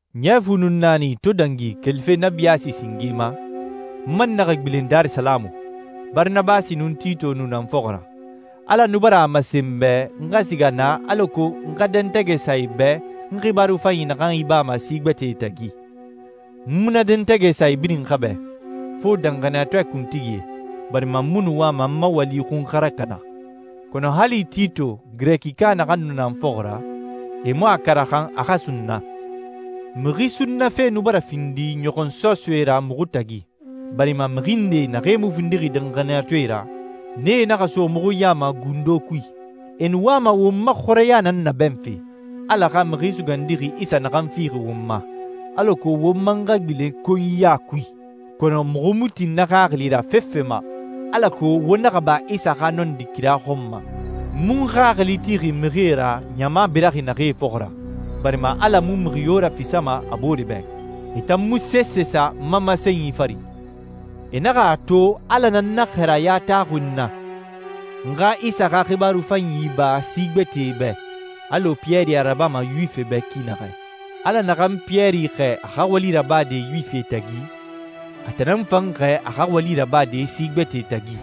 Ɲɛ fu nun naani to dangi kelife na biyaasi singe ma, n man naxa gbilen Darisalamu. Baranabasi nun Tito nu na n fɔxɔ ra. Ala nu bara a masen n bɛ n xa siga naa alako n xa dɛntɛgɛ sa e bɛ n xibaaru fanyi naxan ibama si gbɛtɛe tagi. N mu na dɛntɛgɛ sa e birin xa bɛ, fo danxaniyatɔɛ kuntigie, barima n mu nu wama n ma wali xun xa rakana. Kɔnɔ hali Tito Girɛkika naxan nu na n fɔxɔ ra, e mu a karaxan a xa sunna. Mixi sunnafe nu bara findi ɲɔxɔnsɔsɔɛ ra muxu tagi, barima mixi nde naxee mu findixi danxaniyatɔɛe ra, nee naxa so muxu ya ma gundo kui. E nu wama won ma xɔrɛya nan nabɛnfe, Ala xa Mixi Sugandixi Isa naxan fixi won ma, alako won man xa gbilen konyiya kui. Kɔnɔ muxu mu tin na xaxili ra fefe ma, alako wo naxa ba Isa xa nɔndi kira xɔn ma. N mu n xaxili tixi mixie ra ɲama biraxi naxee fɔxɔ ra, barima Ala mu mixi yo rafisama a boore bɛ. E tan mu sese sa n ma masenyi fari. E naxa a to Ala nan na xɛɛraya taxuxi n na, n xa Isa xa xibaaru fanyi iba si gbɛtɛe bɛ, alɔ Piyɛri a rabama Yuwifie bɛ ki naxɛ. Ala naxan Piyɛri xɛɛ a xa wali rabade Yuwifie tagi, a tan nan n fan xɛɛ a xa wali rabade si gbɛtɛe tagi.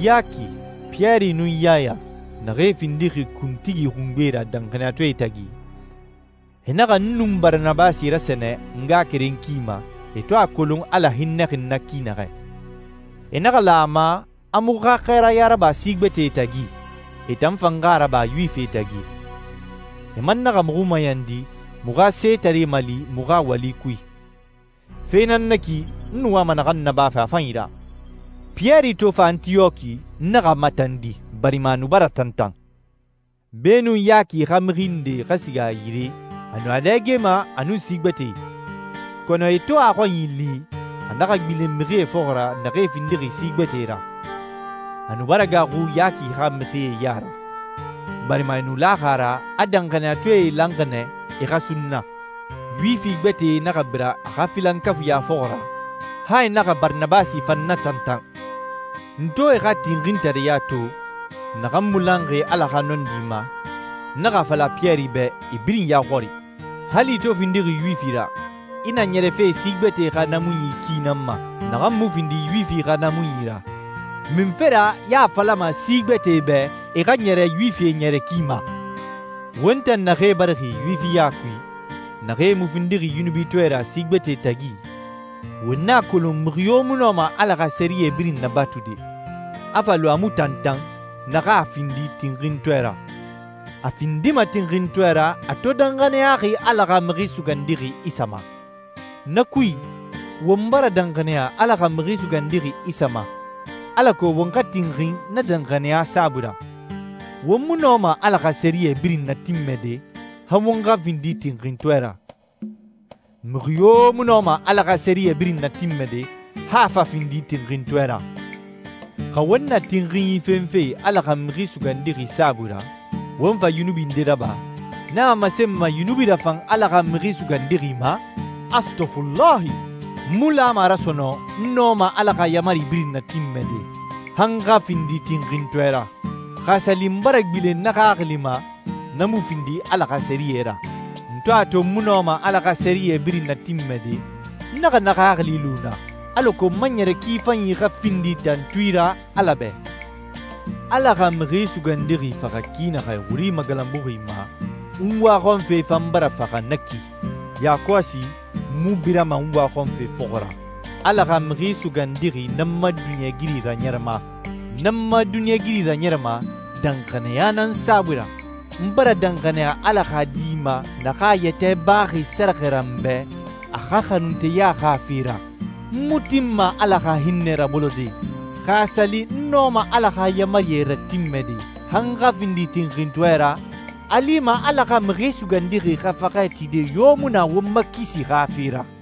Yaki, Piyɛri, nun Yaya naxee findixi kuntigi xungbee ra danxaniyatɔɛe tagi, e naxa n nun Baranabasi rasɛnɛ a ngaxakeren ki ma e to a kolon Ala hinnɛxi n na ki naxɛ. E naxa lan a ma a muxu xa xɛɛraya raba si gbɛtɛe tagi, e tan fan xa a raba Yuwifie tagi. E man naxa muxu mayandi muxu xa setaree mali muxu xa wali kui. Fe nan na ki n nu wama naxan nabafe a fanyi ra. Piyɛri to fa Antiyɔki, n naxa a matandi, barima a nu bara tantan. Beenun Yaki xa mixi ndee xa siga a yire, a nu a dɛgema a nun si gbɛtɛe. Kɔnɔ e to a xɔnyi li, a naxa gbilen mixie fɔxɔ ra naxee findixi si gbɛtɛe ra. A nu bara gaaxu Yaki xa mixie ya ra, barima e nu laxi a ra a danxaniyatɔɛe lanxi nɛ e xa sunna. Yuwifi gbɛtɛe naxa bira a xa filankafuiɲa fɔxɔ ra, han e naxa Baranabasi fan natantan. N to e xa tinxintareya to, naxan mu lanxi Ala xa nɔndi ma, n naxa a fala Piyɛri bɛ e birin ya xɔri, «Hali i to findixi Yuwifi ra, i na ɲɛrɛfe si gbɛtɛe xa naamunyi ki nan ma, naxan mu findi Yuwifi xa naamunyi ra. Munfe ra i a falama si gbɛtɛe bɛ e xa ɲɛrɛ Yuwifie ɲɛrɛ ki ma?» Won tan naxee barixi Yuwifiya kui, naxee mu findixi yunubitɔɛe ra si gbɛtɛe tagi, won a kolon mixi yo mu nɔma Ala xa sɛriyɛ birin nabatude, a fa lu a mu tantan na xa a findi tinxintɔɛ ra. A findima tinxintɔɛ ra a to danxaniyaxi Ala xa Mixi Sugandixi Isa ma. Na kui, won bara danxaniya Ala xa Mixi Sugandixi Isa ma, alako won xa tinxin na danxaniya saabui ra. Won mu nɔma Ala xa sɛriyɛ birin natinmɛde, han won xa findi tinxintɔɛe ra. Mixi yo mu nɔma Ala xa sɛriyɛ birin natinmɛde, han a fa findi tinxintɔɛ ra. Xa won na tinxinyi fenfe Ala xa Mixi Sugandixi saabui ra, won fa yunubi nde raba, na a masenma yunubi rafan Ala xa Mixi Sugandixi ma? Astɔfulahi. N mu lama a ra sɔnɔn n nɔma Ala xa yaamari birin natinmɛde, han n xa findi tinxintɔɛ ra. Xa a sa li n bara gbilen na xaxili ma, na mu findi Ala xa sɛriyɛ ra. N to a to n mu nɔma Ala xa sɛriyɛ birin natinmɛde, n naxa na xaxili lu na, alako n ma ɲɛrɛ ki fanyi xa findi tantui ra Ala bɛ. Ala xa Mixi Sugandixi faxa ki naxɛ wuri magalanbuxi ma, n waxɔnfe fan bara faxa na ki. Yakɔsi n mu birama n waxɔnfe fɔxɔ ra. Ala xa Mixi Sugandixi nan n ma duniɲɛigiri raɲɛrɛma. N n ma duniɲɛigiri raɲɛrɛma danxaniya nan saabui ra. N bara danxaniya Ala xa Di ma naxan a yɛtɛ baxi sɛrɛxɛ ra n bɛ a xa xanunteya xa fe ra. N mu tinma Ala xa hinnɛ rabolode. Xa a sa li n nɔma Ala xa yaamarie ratinmɛde han n xa findi tinxintɔɛ ra, a lima Ala xa Mixi Sugandixi xa faxɛ tide yo mu na won ma kisi xa fe ra.